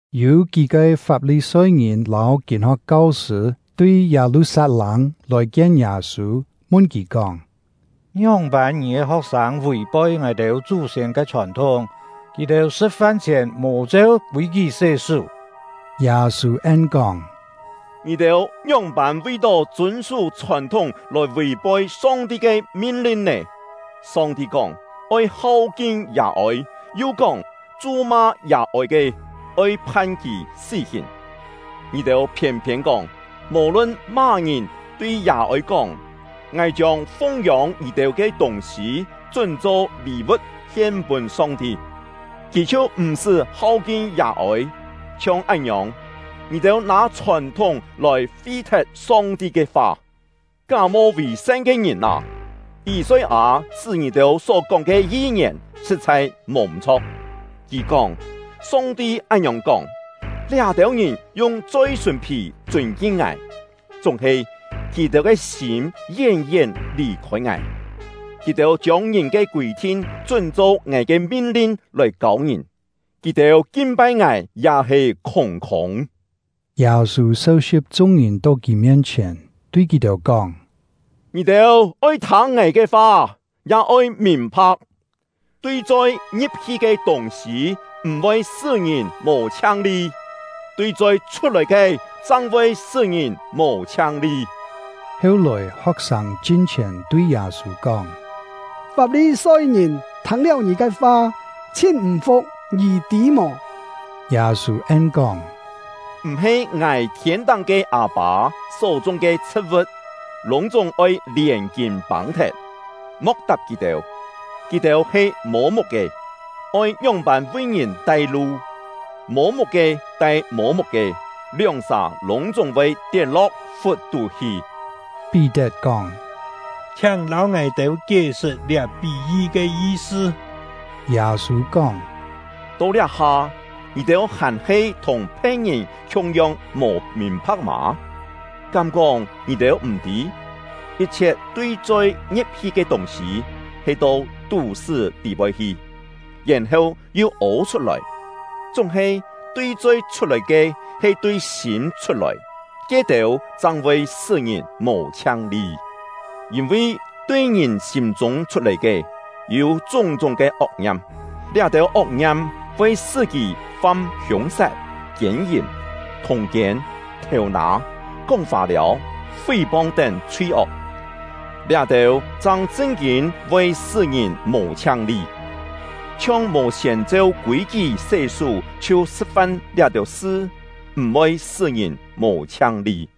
Yû kí-ke Fap-li-soi-ngìn lâu kîn-ho̍k kau-sṳ̂ tui Yâ-lu-sat-lâng lòi-kien Yâ-sû, mun kì kóng: “Ngióng-pân ngì ke ho̍k-sâng vì-poi ngài-têu chú-siên ke chhòn-thúng? Kì-têu sṳ̍t-fan chhièn mò cheu kûi-kí sé-sú!” Yâ-sû en-kóng: “Ngì-têu ngióng-pân vi-tó chûn-sú chhòn-thúng lòi vì-poi Song-ti ke min-lin nè? Song-ti kóng: ‘Oi hau-kin yà-ôi’; yu kóng: ‘Chu-ma yà-ôi ke, oi phan kì sí-hìn.’ Ngì-têu phiên-phiên kóng, mò-lun má-ngìn tui yà-ôi kóng: ‘Ngài chiông fung-yông ngì-têu ke tûng-sî chún-cho lî-vu̍t hien-pûn Song-ti’, kì chhiu m̀-sṳ́ hau-kin yà-ôi. Chhiong án-ngiòng, ngì-têu nâ chhòn-thúng lòi fi-thet Song-ti ke fa. Ká-mo vì-san ke ngìn â, Yî-soi-â chṳ́ ngì-têu só-kóng ke yi-ngièn sṳ̍t-chhai mò m̀-chho̍k! Kì kóng: Song-ti án-ngiòng kóng: ‘Liá-têu ngìn yung choi-sùn-phì chûn-kin Ngài, chúng-he kì-têu ke sîm yén-yén lì-khôi Ngài. Kì-têu chiông ngìn ke kûi-thin chún-cho Ngài ke min-lin lòi kâu ngìn; kì-têu kin-pai Ngài ya he khûng-khûng.’” Yâ-sû seu-si̍p chung-ngìn to kì mien-chhièn, tui kì-têu kóng: “Ngì-têu oi thâng ngài ke fa, ya oi mìn-pha̍k! Tui choi ngi̍p-hi ke tûng-sî m̀-voi sṳ́ ngìn mò chhiang-li; tui choi chhut-lòi ke chang voi sṳ́ ngìn mò chhiang-li.” Heu-lòi, ho̍k-sâng chin-chhièn tui Yâ-sû kóng: “Fap-li-soi-ngìn thâng-liáu ngì ke fa chhin m̀-fu̍k, ngì tî mò?” Yâ-sû en-kóng: “M̀-he ngài thiên-táng ke Â-pâ só-chung ke chhṳ̍t-vu̍t, lûng-chúng oi lièn kîn pâng-thet. Mo̍k tap kì-têu! Kì-têu he mô-muk-ke, oi ngióng-pân vi ngìn tai-lu; mô-muk-ke tai mô-muk-ke, lióng-sà lûng-chúng voi tiet-lo̍k fut-tú hi.” Pí-tet kóng: “Chhiáng lâu ngài-têu kié-sṳt liá pí-yi ke yi-sṳ.” Yâ-sû kóng: “To liá-ha ngì-têu hàn-he thùng phe̍t-ngìn khiung-yong mò mìn-pha̍k mâ? Kám-kóng ngì-têu m̀ tî? Yit-chhiet tui choi ngi̍p-hi ke tûng-sî, he to tú-sṳ́ tî-poi hi, yèn-heu yu ô chhut-lòi. Chúng-he tui choi chhut-lòi ke he tui sîm chhut-lòi; ke-têu chang voi sṳ́ ngìn mò chhiang-li. Yîn-vi tui ngìn sîm-chûng chhut-lòi ke, yû chúng-chúng ke ok-ngiam; liá-têu ok-ngiam voi sṳ́ kì fam hiûng-sat, kiên-yìm, thûng-kiên, thêu-nâ, kóng fâ-liâu, fí-pong tén chhui-ok. Liá-têu chang chṳn-kîn voi sṳ́ ngìn mò chhiang-li. Chhiong mò siên cheu kûi-kí sé-sú chhiu sṳ̍t-fan liá-têu sṳ, m̀-voi sṳ́ ngìn mò chhiang-li.”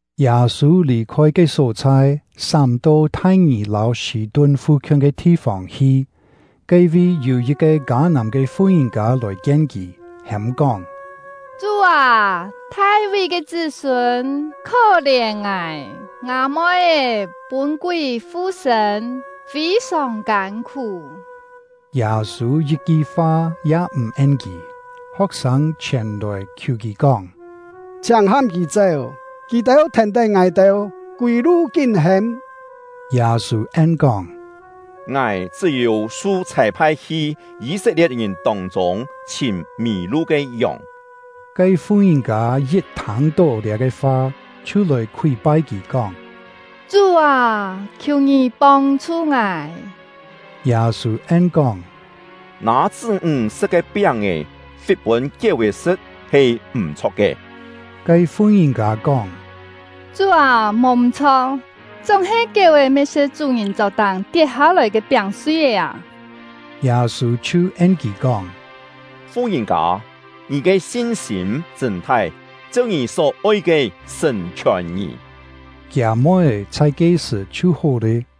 Yâ-sû lì-khôi ke só-chhai, sám-to Thai-ngì lâu Sî-tun fu-khiun ke thi-fông hi. Ke-vi yû yit-ke Kâ-nàm ke fu-ngìn-kâ lòi kien kì, hêm-kóng: “Chú â, Thai-ví ke chṳ́-sûn, khó-lièn ngài! Ngâ moi-é pûn kúi fu-sṳ̂n, fî-sòng kân-khú!” Yâ-sû yit-ki fa ya m̀ en kì. Ho̍k-sâng chhièn-lòi khiù kì kóng: “Chhiáng ham kì chéu! Kì thèn-tén ngài-têu, kûi-lu kín hêm!” Yâ-sû en-kóng: “Ngài chṳ́-yû su chhâi-phai hi Yî-set-lie̍t-ngìn tông-chûng chhìm mì-lu ke yòng.” Ke fu-ngìn-kâ yit thâng-tó liá-ke fa, chhiu lòi khúi-pai kì, kóng: “Chú â, khiù ngì pông-chhu ngài!” Yâ-sû en-kóng: “Nâ chṳ́-ńg sṳ̍t ke piáng-è fit pûn kiéu-è sṳ̍t he m̀-chho̍k ke.” Ke fu-ngìn-kâ kóng: “Chú â, mò m̀-chho̍k, chúng-he kiéu-è me sṳ̍t chú-ngìn chok-táng tiet hâ-lòi ke piáng-sui-é â!” Yâ-sû chhiu en kì kóng: “Fu-ngìn-kâ, ngì ke sin-sîm chṳ̂n-thai! Cheu ngì só-oi ke sṳ̀n-chhiòn ngì!” Kiâ moi-é chhai ke-sṳ̀ chhiu hó lé.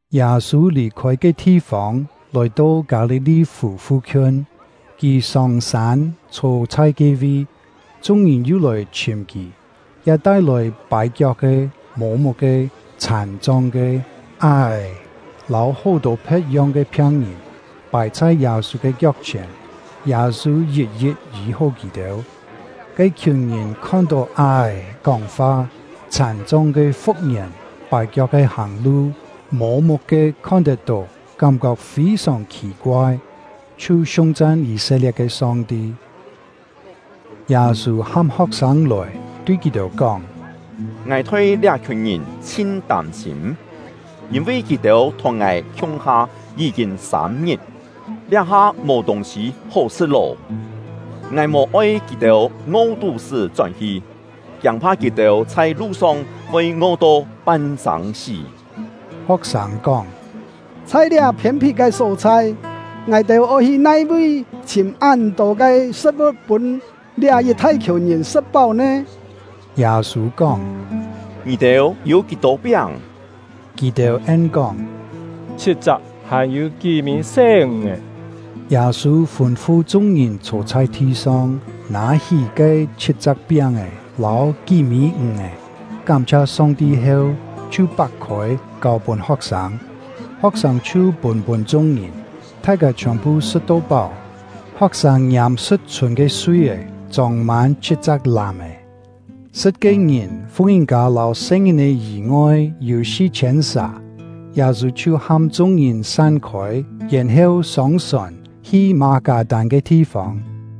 Yâ-sû lì-khôi ke thi-fông, lòi-to Kâ-li-li-fù fu-khiun; kì sông-sân, chhô chhai ke-vi. Chung-ngìn yu lòi chhìm kì, ya tai-lòi pài-kiok-ke, mô-muk-ke, chhàn-chong ke, á-è, lâu hó-tô phe̍t-yong ke phiang-ngìn, pài chhai Yâ-sû ke kiok-chhièn; Yâ-sû yit-yit yî-hó kì-têu. Ke-khiùn ngìn khon-tó á-è kóng-fa, chhàn-chong ke fu̍k-ngièn, pài-kiok-ke hàng-lu, mô-muk-ke khon-tet-tó, kám-kok fî-sòng khì-koai, chhiu siung-chan Yî-set-lie̍t ke Song-ti. Yâ-sû ham ho̍k-sâng lòi, tui kì-têu kóng: “Ngài thoi liá-khiùn ngìn chhin tâm-sîm, yîn-vi kì-têu thùng ngài khiung-ha yí-kîn sâm-ngit, liá-ha mò tûng-sî hó sṳ̍t lô. Ngài mò-oi kì-têu ngo tú-sṳ́ chón-hi, kiâng-pha kì-têu chhai lu-song voi ngo-to pan-sâng-sí.” Ho̍k-sâng kóng: “Chhai liá phiên-phit ke só-chhai, ngài-têu oi hi nai-vi chhìm án-tô ke sṳ̍t-vu̍t pûn liá yit thai-khiùn ngìn sṳ̍t-páu nè?” Yâ-sû kóng: “Ngì-têu yû kí-tô piáng?” Kì-têu en-kóng: “Chhit-chak, hàn-yû kí-mî se ǹg-è.” Yâ-sû fûn-fu chung-ngìn chhô chhai thi-song, nâ-hí ke chhit-chak piáng-è lâu kí-mî ǹg-è, kám-chhia Song-ti heu, chhiu pak-khôi, kâu-pûn ho̍k-sâng; ho̍k-sâng chhiu pûn-pûn chung-ngìn. Thai-kâ chhiòn-phu sṳ̍t-to páu. Ho̍k-sâng ngiâm sṳ̍t-chhûn ke sui-é, chông-mân chhit-chak làm-è. Sṳ̍t ke ngìn, fu-ngìn-kâ lâu se-ngìn-è yî-ngoi, yû si-chhiên sà. Yâ-sû chhiu ham chung-ngìn san-khôi, yèn-heu sông-sòn, hi Mâ-kâ-tân ke thi-fông.